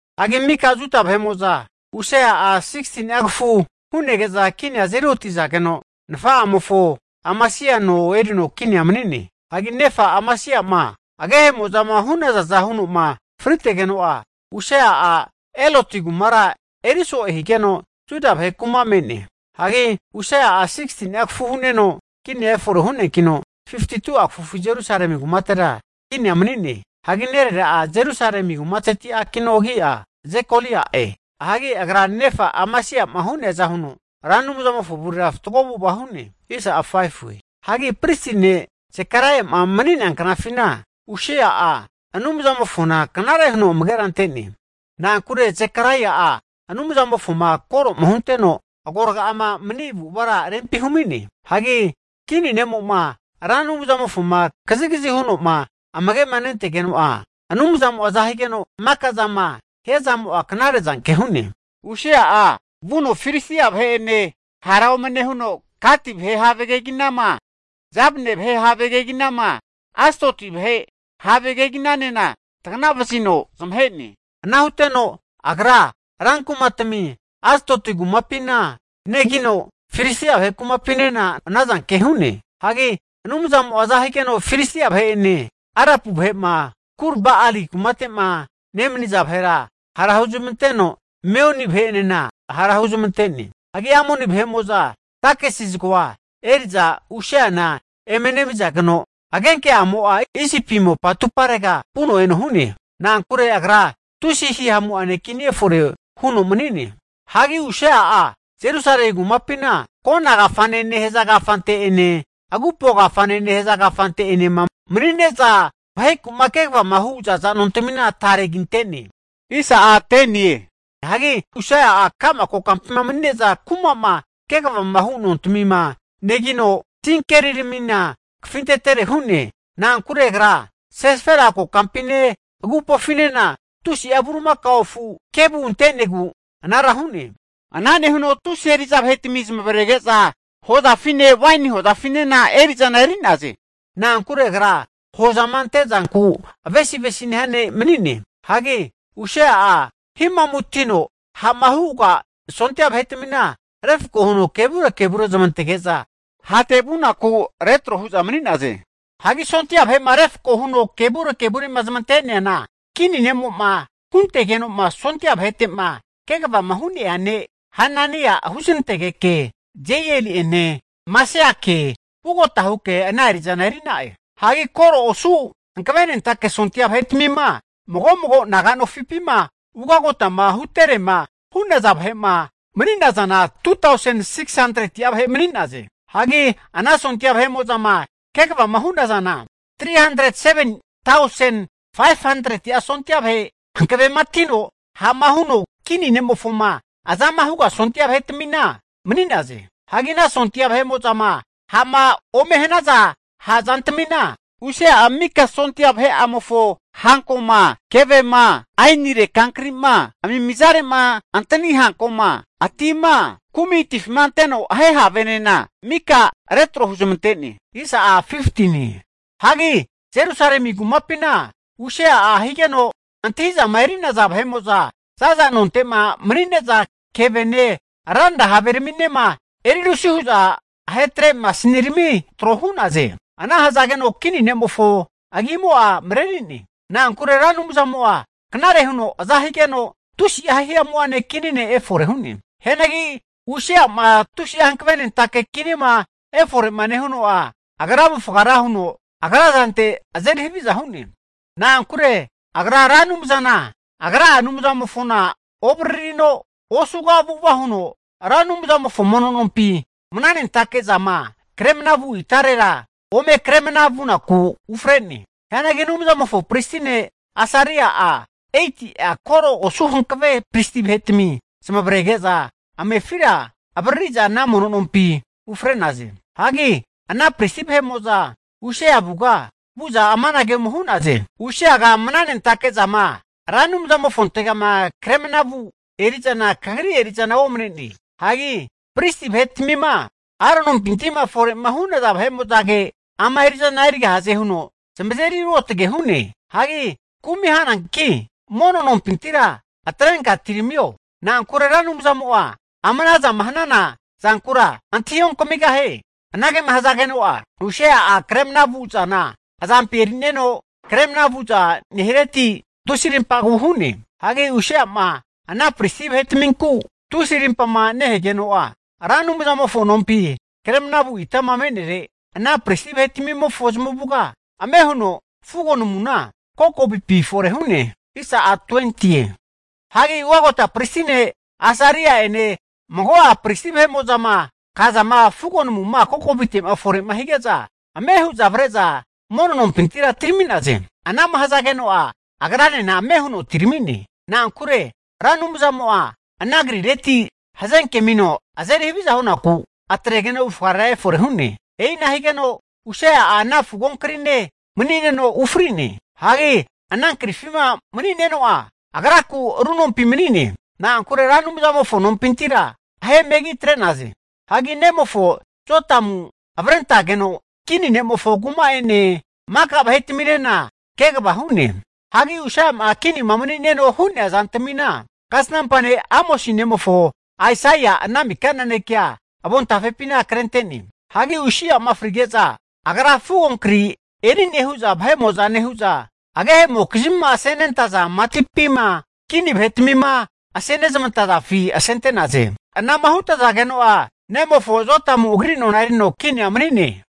Hagi maka Juda vahe'mo'za Usia'a 16ni'a kafu hu'nege'za kinia azeri otizageno, nafa'amofo Amasia no erino kinia mani'ne. Hagi nefa Amasia'ma agehe'mo'zama hu'nazaza huno'ma fritegeno'a, Usia'a Eloti kumara eri so'e higeno Juda vahe kuma me'ne. Hagi Usia'a 16ni'a kafu hu'neno kinia efore hu'neankino 52'a kafu Jerusalemi kumatera kinia mani'ne. Hagi nerera'a Jerusalemi kumateti akino, agi'a Jekolia'e. Hagi agra nefa Amasia'ma hu'neaza huno Ra Anumzamofo avurera fatgo avu'ava hu'ne. Hagi Zekaraia'ma mani'nea knafina Usia'a Anumzamofona knare huno amagera ante'ne. Na'ankure Zekaraia'a Anumzamofoma koro'ma hunteno, agoraga'ama mani avu'avara rempi humi'ne. Hagi kini ne'mo'ma Ra Anumzamofoma kazigazi huno'ma amage'ma nentegeno'a, Ra Anumzamo aza higeno maka zama hiazamo'a knare'zanke hu'ne. Hagi Usia'a vuno Filistia vahe'ene hara ome nehuno Gati kumate have keginama, Jabne kumate have keginama, Astodi kumate have keginanena taganavazino zamahe'ne. Ana huteno agra ran kumatami Astodi kumapina negino, Filistia vahe kumapinena ana zanke hu'ne. Hagi Anumzamo'a aza higeno Filistia vahe'ene, Arapu vahe'ma, Gur-Ba'ali kumapima nemaniza vahera hara hunezmanteno, Meuni vahe'enena hara huzmante'ne. Hagi Amoni vahe'mo'za takisi zagoa eri'za Usiana eme nemizageno, agenke'amo'a Isipi mopa atumparega vuno eno hu'ne. Na'ankure agra tusi hihamu'ane kini efore huno mani'ne. Hagi Usia'a Jerusalemi kumapina Kona kafane nehaza kafante'ene Agupo Kafane nehaza kafante'enema mani'neza vaheku'ma kegavama hu za'za nontamina kinte'ne. Hagi Usia'a ka'ma kokampima manine'za kuma'ma kegavama hu nontmina negino, tinkeriramina kafintetere hu'ne. Na'ankure agra Sefela kokampine, agupofinena tusi'a bulimakao afu kevu ante'negu anara hu'ne. Ana nehuno tusi eri'za vahetami zamavarege'za hozafine, waini hozafinena eri'zana eri'naze. Na'ankure agra hozama ante'zanku avesi avesi nehia ne' mani'ne. Hagi Usia'a himamutino ha'ma huga sondia vahe'tmina, refko huno kevure kevure zmantege'za hate vunaku retro hu'za mani'naze. Hagi sondia vahe'ma refko huno kevure kevure'ma zmante'neana, kini ne'mo'ma huntegeno'ma sondia vahete'ma kegavama hu'nea ne' Hanania'a huznantegeke Jeieli'ene Maseiake vugota huke ana eri'zana eri'na'e. Hagi koro osu hankavenentake sondia vahetmima mago mago naga nofipima ugotama huterema hu'naza vahe'ma mani'nazana 2tausen 600'a vahe mani'naze. Hagi ana sondia vahe'mo'zama kegavama hu'nazana 307tausen 500'a sondia vahe hankavematino ha'ma huno, kini ne'mofoma azama huga sondia vahetamina mani'naze. Hagi ana sondia vahe'mo'zama ha'ma ome hanaza ha' zantamina, Usia'a mika sondia vahe'amofo hankoma, kevema, ainire kankri'ma, amimizare'ma antani hankoma, atima, kumi atifima anteno ahe havenena mika retro huzmante'ne. Hagi Jerusalemi kumapina Usia'a higeno antahi'zama eri'naza zaza nonte'ma mani'neza kevene ranra haveraminema erirusi hu'za ahetre masinirami tro hu'naze. Ana hazageno, kini ne'mofo agimo'a mareri'ne. Na'ankure Ra Anumzamo'a knare huno aza higeno tusi'a hihamu'ane kini ne' efore hu'ne. Hianagi Usia'ma tusi'a hanavenentake kinima efore'ma nehuno'a, agra avufga ra huno agra zante azeri haviza hu'ne. Na'ankure agra Ra Anumzana agra'a Anumzamofona ovaririno, osuga avu'ava huno Ra Anumzamofo mono nompi mnanentake zama kremna vu itarera ome kre mna vunaku ufre'ne. Hianagi Anumzamofo pristi ne' Asaria'a, 80'a koro osu hankave pristi vahetami zamavarege'za amefira avaririza ana mono nompina ufre'naze. Hagi ana pristi vahe'mo'za Usia avuga vu'za amanage ome hu'naze, Usiaga mnanentake zama Ra Anumzamofontegama kre mnama vu eri'zana kagri eri'zana omne'ne. Hagi pristi vahetmima Aronimpinti'ma fore'ma hu'naza vahe'mo'zage ama eri'zana erigahaze huno zamazeri ruotge hu'ne. Hagi kumi hananki mono nompintira atrenka atiramio. Na'ankure Ra Anumzamo'a, ama ana zama hana zankura antahi onkamigahie. Anagema hazageno'a, Usia'a kre mna vu zana azampi eri'neno kre mna vu'za nehireti tusi arimpagu hu'ne. Hagi Usia'ma ana pristi vahetaminku tusi rimpama nehegeno, Ra Anumzamofo nompi kre mnavu itama me'nere ana pristi vahetmimofo zamavuga ame huno fugo namuna kokovipi fore hu'ne. Hagi ugagota pristi ne' Asaria'ene, mago'a pristi vahe'mo'zama kazama fugo namuma kokovitema fore'ma hige'za, ame hu'za avre'za mono nompintira atirami'naze. Ana'ma hazageno'a, agranena ame huno atirami'ne. Na'ankure Ra Anumzamo'a ana krireti hazenke amino azeri haviza hunaku, atregeno avufgarera efore hu'ne. E'ina higeno Usia'a ana fugonkrine mani'neno ufri'ne. Hagi ana krifima mani'neno'a, agraku ru nompi mani'ne. Na'ankure Ra Anumzamofo nompintira ahe megi atre'naze. Hagi nemofo Jotamu avrentageno kini ne'mofo kuma'ene maka vahetaminena kegava hu'ne. Hagi Usia'ma kinima mani'neno hu'nea zantamina, Kasnampa ne' Amosi nemofo Aisaia ana mika nanekea avontafepina krente'ne. Hagi Usia'ma frige'za, agra fugo kri eri'ne hu'za nehu'za, agehemokizmima asenezamantazafi matipima kini vahetmima asenezmantazafi asente'naze. Anama hutazageno'a, nemofo Jotamu agri nona erino kinia mani'ne.